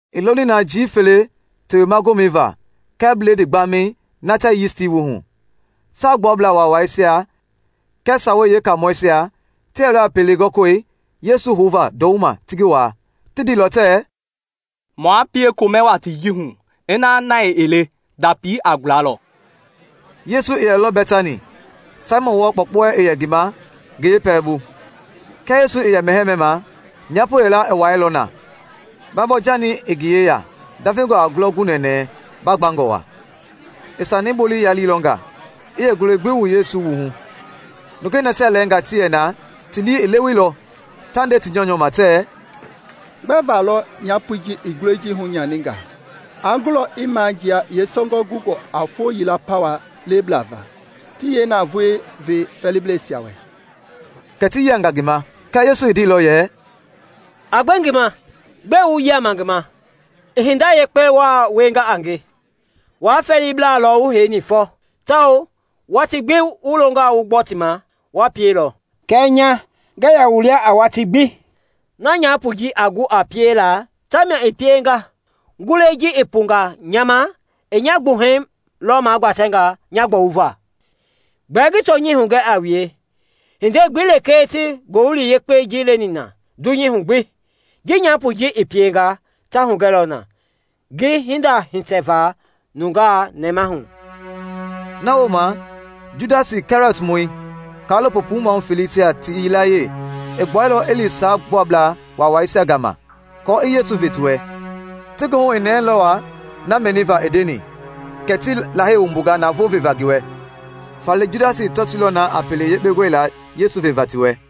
I loni na njii fele Tewema Gomɛi va kɛɛ Bledii Gbamɛi, na tɛɛ yisti wu hu. Saagbuablaa Waawaisia kɛɛ Sawei Yeekaamɔisia ti yɛlɔ a pele gɔli Yesu houva ndɔwuma ti ngi waa. Ti ndeilɔ tɛɛ, “Maa pie komɛ watii ji hu, ina na ii le, ndapi a gulalɔ.” Yesu i yɛlɔ Bɛtani, Saimɔn wɔɔ kpɔukpɔui i yɛ ngi ma, ngi yeepɛlɛbu. Kia Yesu i yɛ mɛhɛɛ mɛma, nyapo yila i wuailɔ na, baabɔɔ-janii i ngi yeya ndavengɔ a ngulɔ gu nɛnɛɛ bagbangɔ wa. I sanii bolei yaliilɔ nga, i yeengulɔi gbi wu Yesu wui hu. Nungei nasia lɛɛngaa ti yɛ na ti lii i leweilɔ, ta nde ti nyɔunyɔ ma tɛɛ, “Gbɛva lɔ nyapoi ji i ngulɔi ji hunyaninga? Aa gulɔ i majia yeesɔngɔi gungɔ a foo yila pawa lebla va, ti yeenavoei ve fɛɛliblɛisia wɛ!” Kɛ ti yianga ngi ma. Kɛɛ Yesu i ndeilɔ yɛ, “A gbe ngi ma! Gbɛe wu yiama ngi ma? I hinda yekpe wa wienga a nge. Wua fɛɛlibla lɔ wu heini fɔ, tawao watii gbi wu longɔ wu gbɔ ti ma, wa pielɔ. Kɛɛ nya, ngɛɛ yɛ wu lia a watii gbi. Na nyapoi ji a gu a piela tamia i pienga; ngulɔi ji i punga nya ma i nya gbuhɛi lɔ magbatɛnga nya gbɔwuva. Gbɛɛ ngi tɔnyɛi hugɛ a wue, hindei gbi lekee ti Ngowili Yekpei ji leni na dunyei hu gbi, ji nyapoi ji i pienga, ta hugɛlɔ na ngi hinda hitɛva nungaa nɛmahu.” Na wooma Judasi Kɛriɔtmɔi, kaalopo puu maahu feleisia ti yilayee, i gbuɛilɔ i li Saagbuablaa waawaisia gama aako i Yesu ve ti wɛ. Ti goohu i nɛɛlɔ wa na mɛniva i ndeni kɛ ti Lahei wumbunga navoo veva ngi wɛ. Faale Judasi i tɔtoilɔ na a pele yekpe gɔlila Yesu veva ti wɛ.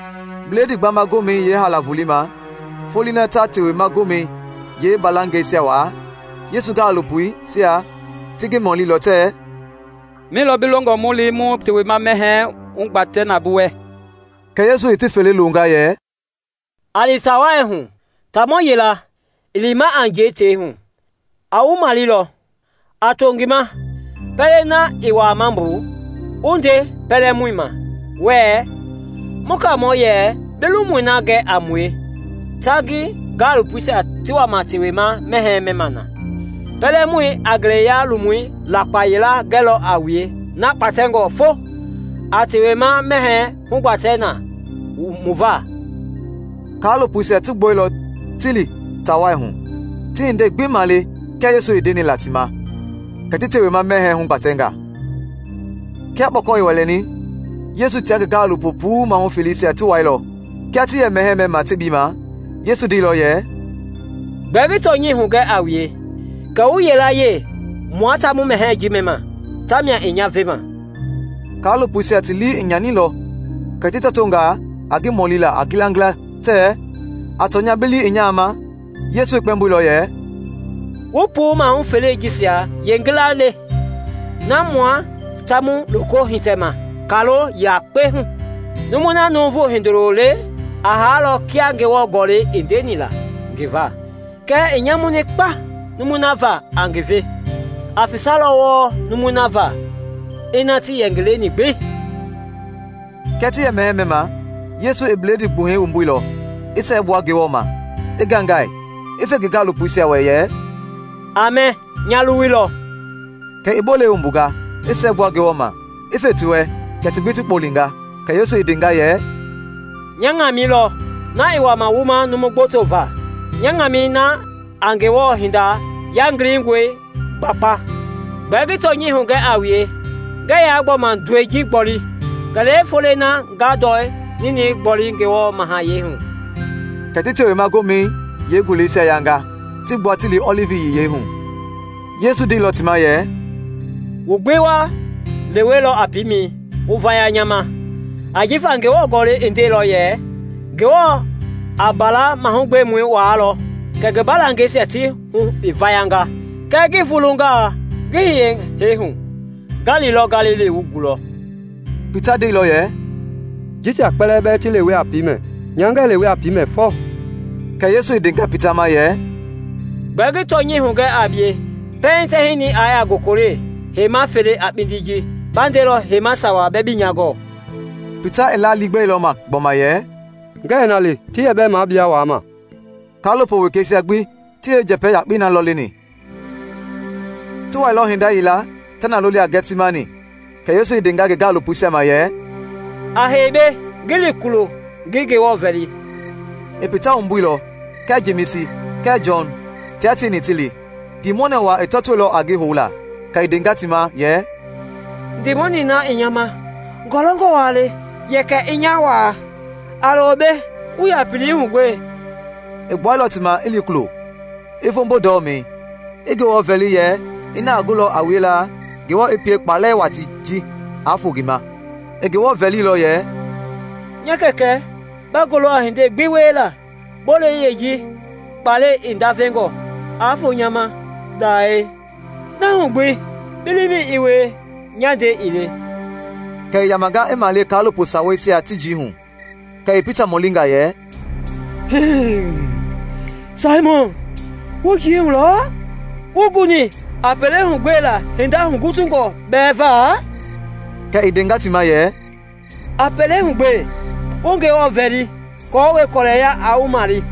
Bledii Gbama Gomɛi yeehaala volei ma, foloi na ta Tewema Gomɛi yeembalangɛisia waa, Yesu gaalopoisia ti ngi mɔlilɔ tɛɛ, “Mi lɔ bi longɔ mu li mu Tewema mɛhɛɛ hugbatɛ na bi wɛ?” Kɛ Yesu i ti fele loonga yɛ, “A li taa wai hu; taamɔ yila, i lima a njɛi tei hu, a wu malelɔ. A to ngi ma pɛlei na i wuama mbu, wu nde pɛlɛmɔi ma wuɛɛ, ‘Mu Kaamɔ yɛ bi lomui na gɛ a mue tia ngi gaalopoisia ti wama Tewema mɛhɛɛi mɛma na.’ Pɛlɛmɔi a ngeleya-lomu lakpa yila gɛlɔ a wue na gbatɛngɔ fo. A Tewema mɛhɛɛi hugbatɛ na mu va.” Kaalopoisia ti gbuɛilɔ ti li taa wai hu, ti hindei gbi male kia Yesu i ndeni la ti ma; kɛ ti Tewema mɛhɛɛi hugbatɛnga. Kia kpɔkɔ i wɛlɛni, Yesu tia ngi gaalopo puu mahu feleisia ti wailɔ. Kia ti yɛ mɛhɛɛ mɛma tebii ma, Yesu ndeilɔ yɛ, “Gbɛɛ ngi tɔnyɛi hugɛ a wue kɛ wu yilayee mua ta mu mɛhɛɛ ji mɛma tamia i nya vema.” Kaalopoisia ti lii i nyanilɔ kɛ ti tɔtonga a ngi mɔlila a ngilangila tɛɛ, A tɔnya bi lii ii nya ma? Yesu i kpɛmboilɔ yɛ, “Wu puu mahu felei jisia yeengila le, na mua ta mu loko hitɛma kaalo yakpei hu. Numui na Nuuvu Hindoloi le a haalɔ kia Ngewɔ Gɔlɛi i ndeni la ngi va, kɛɛ i nyamuni kpa numui na va a ngi ve! Aa fesalɔ wɔɔ yeenumui na va ina tii yɛ ngi leni gbi.” Kia ti yɛ mɛhɛɛ mɛma, Yesu i bledii gbuhɛi wumbuilɔ, i siɛgbua Ngewɔ ma, i ngaingai, i fe ngi gaalopoisia wɛ yɛ, “A mɛ, nya luwui lɔ.” Kɛ i bolei wumbunga, i siɛgbua Ngewɔ ma, i fe ti wɛ, kɛ ti gbi ti kpɔlenga. Kɛ Yesu i ndenga yɛ, “Nya Ŋamɛi lɔ, na i wama wuma numu gboto va, nya ŋamɛi na a Ngewɔ hinda yangilingɔi gbakpa. Gbɛɛ ngi tɔnyɛi hugɛ a wue, ngɛɛ yaa gbɔma ndɔi ji gboli kɛlee foloi na nga ndɔ ninɛi gboli Ngewɔ mahayɛi hu.” Kɛ ti Tewema Gomɛi yeenguleisia yanga, ti gbua ti li Ɔlivi Yiyei hu. Yesu ndeilɔ ti ma yɛ, “Wu gbi wa lewelɔ a piimɛ wu vaya nya ma, ajifa Ngewɔ Gɔlɛi i ndeilɔ yɛ, ‘Ngewɔ a mbala mahugbemɔi waalɔ kɛ mbalangɛisia ti hu i vayanga.’ Kɛɛ ngi vulungaa ngi hiye hee hu, nga lilɔ Galili wu gulɔ.” Pita i ndeilɔ yɛ, “Jisia kpɛlɛɛ bɛɛ ti lewe a piimɛ nya ngɛɛ lewe a piimɛ fɔ!” Kɛ Yesu i ndenga Pita ma yɛ, “Gbɛɛ ngi tɔnyɛi hugɛ a bie, pɛiŋ tɛhinɛi i yaa gokole heima fele a kpindi ji, ba ndelɔ heima sawa bɛɛ bii nya gɔɔ.” Pita i la liigbɛilɔ ma gbɔma yɛ, “Ngɛɛ na le, ti yɛ bɛɛ mua bia wama!” Kaalopo wekeisia gbi ti yeenjɛpɛ yakpei na lɔ leni. Ti wailɔ hinda yila ta na loli a Gɛtsimani kɛ Yesu i ndenga ngi gaalopoisia ma yɛ, “A hei mbei, ngi li kulo ngi Ngewɔ vɛli.” I Pita wumbuilɔ kɛɛ Jemisi kɛɛ Jɔn tia tieni ti li. Ndiimɔnɛ wa i tɔtoilɔ a ngi houla. Kɛ i ndenga ti ma yɛ, “Ndiimɔnɛi na i nya ma ngɔlɔngɔ wa le, yɛkɛ i nya waa. A lo mbei wu yɛ a pelehu gbe.” I gbuailɔ ti ma i li kulo, i voombo ndɔmɛi, i Ngewɔ vɛli yɛ ina a gulɔ a wiela, Ngewɔ i pie kpalɛ watii ji aa foo ngi ma. I Ngewɔ vɛlilɔ yɛ “Nya Kɛkɛ, ba gulɔ a hinda gbi wiela. Bolei yeeji, kpalɛi i ndavengɔ, aa foo nya ma dae. Na hu gbi bi liimɛi i wie, nya ndɛi ii le.” Kɛ i yamanga i male kaalopo saweisia ti njii hu, kɛ i Pita mɔlinga yɛ, “Saimɔn, wu njii hu lɔ? Wuii guni a pelehu gbela hinda hugutungɔ bɛɛ va?” Kɛ i ndenga ti ma yɛ, “A pelehu gbe, wu Ngewɔ vɛli aako kɔlɛya aa wu male.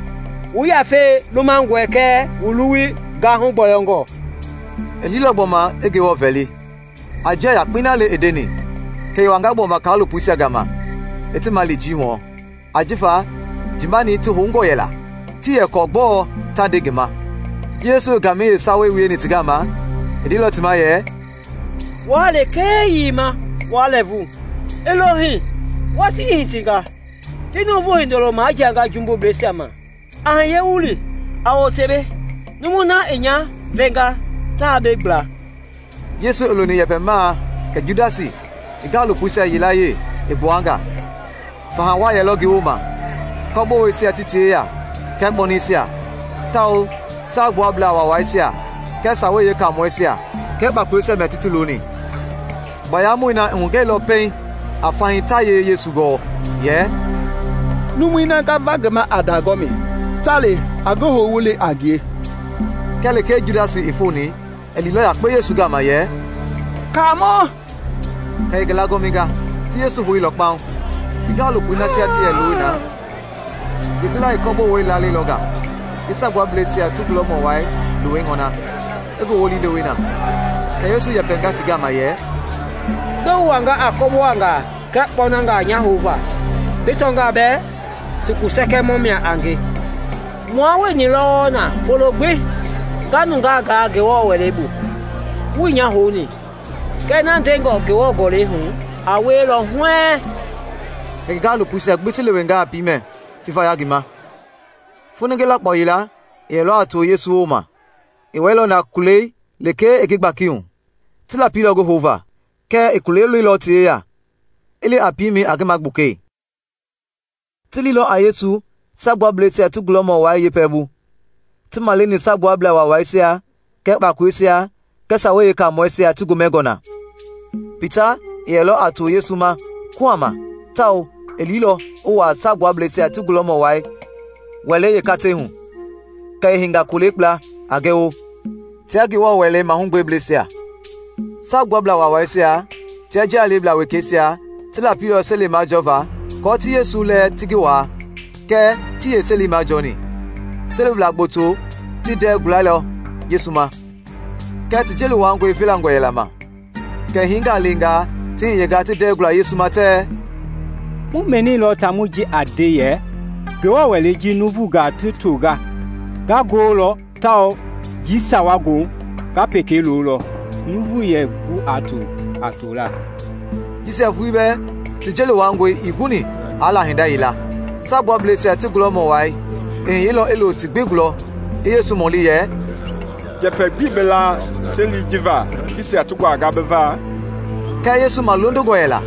Wu yafei lumangɔe kɛɛ wu luwui gahu gbɔyɔngɔe.” I liilɔ gbɔma i Ngewɔ vɛli, a njia yakpei na le i ndeni. Kɛ i wanga gbɔma kaalopoisia gama i ti male njii hu, jifa njii mani ti houngɔ yɛla. Tii yɛ kɔɔ gbɔɔ ta nde ngi ma. Ji Yesu i ngamɛi yeesawei wieni ti gama, i ndeilɔ ti ma yɛ, “Wua lekee yiima wa lɛɛvu? I lo hii! Watii i hitinga! Ti Nuuvu Hindoloi majianga jumbubleisia ma. A hiye mu li. A wote mbei, numui na i nya vema taa mbei gbla.” Yesu i loni yɛpɛmaa kɛ Judasi, ngi gaalopoisia yilayee, i gbua nga. Faha wa yɛlɔ ngi wooma, kɔboweisia ti ti yeya kɛɛ kpɔnɛisia, tawao Saagbuablaa Waawaisia kɛɛ Sawei Yeekaamɔisia kɛɛ kpakoleisia mia ti ti loni. Baayamɔi na i hugɛilɔ pɛiŋ a fahii ta yee Yesu gɔɔ, yɛ, “Numui na nga va ngi ma a ndagɔmi, ta le. A ngi hou wu li a ngie.” Kia lekee Judasi i foni, i liilɔ yakpe Yesu gama yɛ, “Kaamɔ!” kɛ i ngi lagɔminga. Ti Yesu houilɔ kpaŋ. Ngi gaalopoi nasia ti yɛ looni na, yeengila i kɔbowei laalɛilɔ nga i Saagbuablɛisia ti gulɔmɔ wai luwei ŋɔna, i ngi wolii lewe na. Kɛ Yesu i yɛpɛnga ti gama yɛ, “Gbɛe wu wani a kɔbowangaa kɛɛ kpɔnangaa nya houva bi tɔngaa bɛɛ sukusɛkɛmɔ mia a nge? Mua wueni lɔ wɔɔ na folo gbi, nga nungaa gaa Ngewɔ Wɛlei bu, wuii nya houni. Kɛɛ na ndengɔ Ngewɔ Gɔlɛi hu a wielɔ huɛɛŋ.” Kɛ ngi gaalopoisia gbi ti lewenga a piimɛ, ti vaya ngi ma. Foninge lakpao yila, i yɛlɔ a too Yesu wooma, i wɛilɔ na kulei lekee i ngi gbakihu. Ti lapilɔ ngi houva, kɛɛ i kulei loilɔ ti yeya, i li a piimɛi a ngi magbukei. Ti liilɔ a Yesu Saagbuablɛisia ti gulɔmɔ wai yeepɛlɛbu. Ti maleni Saagbuablaa Waawaisia kɛɛ kpakoleisia kɛɛ Sawei Yeekaamɔisia ti gomɛngɔ na. Pita i yɛlɔ a too Yesu ma kuhama tawao i liilɔ i wuaa Saagbuablɛisia ti gulɔmɔ wai wɛlei yeekatei hu. Kɛ i heinga kolei kpla, a gɛwo, tia Ngewɔ Wɛlei mahugbeblɛisia. Saagbuablaa Waawaisia tia njia leblaa wekeisia ti lapilɔ seli majɔva aako ti Yesu lɛɛ ti ngi waa kɛɛ tii yeeseli majɔni. Selibla gboto ti ndɛɛ gualɛilɔ Yesu ma, kɛɛ ti jeli wuangɔi velangɔ yɛla ma. Kɛ hiingaa lɛɛngaa ti hiyenga ti ndɛɛ guala Yesu ma tɛɛ, “Mu mɛnilɔ taamɔi ji i nde yɛ, ‘Ngewɔ Wɛlei ji nuuvungaa ti tonga, nga ngololɔ, tawao njii sawa wooma nga peka lolɔ na nuuvu ɛɛ gu a tola.’” Jisia vulii bɛɛ ti jeli wuangɔi ii guni aa la hinda yila. Saagbuablɛisia ti gulɔmɔ wai i hiyeilɔ i lo ti gbi gulɔ i Yesu mɔli yɛ, “Njɛpɛ gbii bi la seli ji va jisia ti nguanga bi va?” Kɛɛ Yesu malondongɔ yɛla,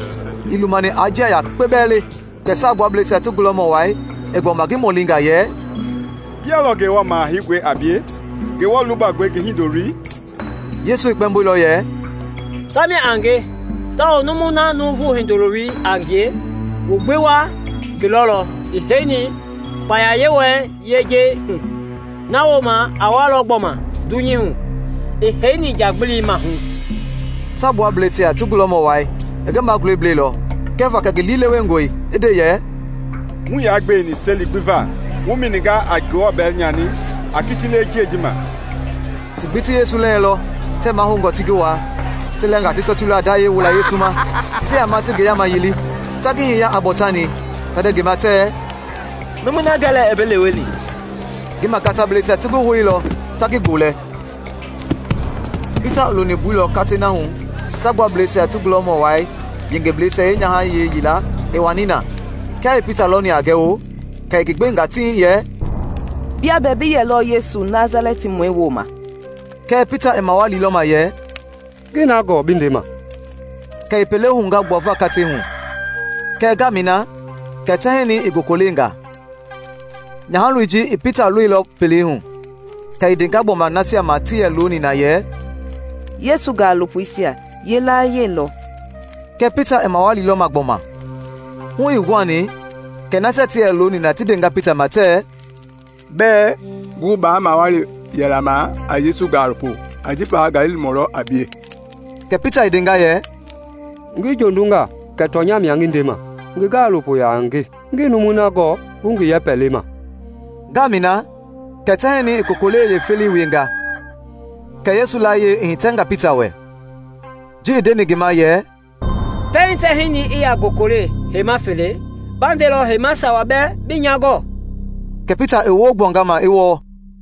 ii lumani aa njia yakpe bɛɛ le. Kɛ Saagbuablɛisia ti gulɔmɔ wai i gbɔma ngi mɔlinga yɛ, “Bia lɔ Ngewɔ Maha Heingɔi a bie, Ngewɔ Lubangɔi ngi Hindoloi?” Yesu i kpɛmboilɔ yɛ, “Tamia a nge, tawao numui na Nuuvu Hindoloi a ngie, wu gbi wa ngi lɔlɔ i heini kpaya Yewɔɛi yejei hu, na wooma a walɔ gbɔma dunyei hu i heini njagbili mahu!” Saagbuablɛisia ti gulɔmɔ wai i ngi magulɛi blɛilɔ kɛva kɛ ngi lii lewengɔe, i nde yɛ, “Muii yaa gbeweni seli gbi va! Wu mɛninga a Ngewɔ bɛlɛ nyani. A kiti lewe njiɛi ma.” Ti gbi ti Yesu lɛɛlɔ tɛɛ mahoungɔ ti ngi waa. Ti lɛɛngaa ti tɔtoilɔ a ndayɛi wula Yesu ma, ti yama ti ngi yaama yili, ta ngi hiya a bɔɔtani, ta nde ngi ma tɛɛ, “Numui na gɛ lɛ i bi leweni!” Ngi magatablɛisia ti ngi houilɔ ta ngi gbolɛ. Pita i loni mbui lɔ katei na hu Saagbuablɛisia ti gulɔmɔ wai yengebleisia yeenyahayee yila i wani na. Kia i Pita lɔni a gɛwo, kɛ i ngi gbenga tiŋ yɛ, “Bia bɛɛ bi yɛlɔ Yesu Nasalɛtimɔi wooma.” Kɛɛ Pita i mawalilɔ ma yɛ, “Ngii na gɔɔ bi ndema.” Kɛ i pele hounga gbuava katei hu, kɛɛ ngamɛi na kɛ tɛhinɛi i gokolenga. Nyahaloi ji i Pita lɔilɔ pelei hu, kɛ i ndenga gbɔma nasia ma ti yɛ looni na yɛ, “Yesu gaalopoisia yilayee lɔ!” Kɛɛ Pita i mawalilɔ ma gbɔma. Hu ii guhani kɛ nasia ti yɛ looni na ti ndenga Pita ma tɛɛ, “Bɛɛ gu baa maawali yɛlaa ma a Yesu gaalopo, ajifa Galilimɔ lɔ a bie.” Kɛ Pita i ndenga yɛ, “Ngi jondunga kɛ tɔnyɛi mia ngi ndema! Ngi gaalopo yaa a nge! Ngii numui na gɔɔ wu ngi yɛpɛ lema!” Ngamɛi na kɛ tɛhinɛi i kokolei yeefelei wienga, kɛ Yesu layie i hitɛnga Pita wɛ, ji i ndeni ngi ma yɛ, “Pɛiŋ tɛhinɛi i yaa gokole heima fele, ba ndelɔ heima sawa bɛɛ bii nya gɔɔ.” Kɛ Pita i woo gbuanga ma, i wɔɔ.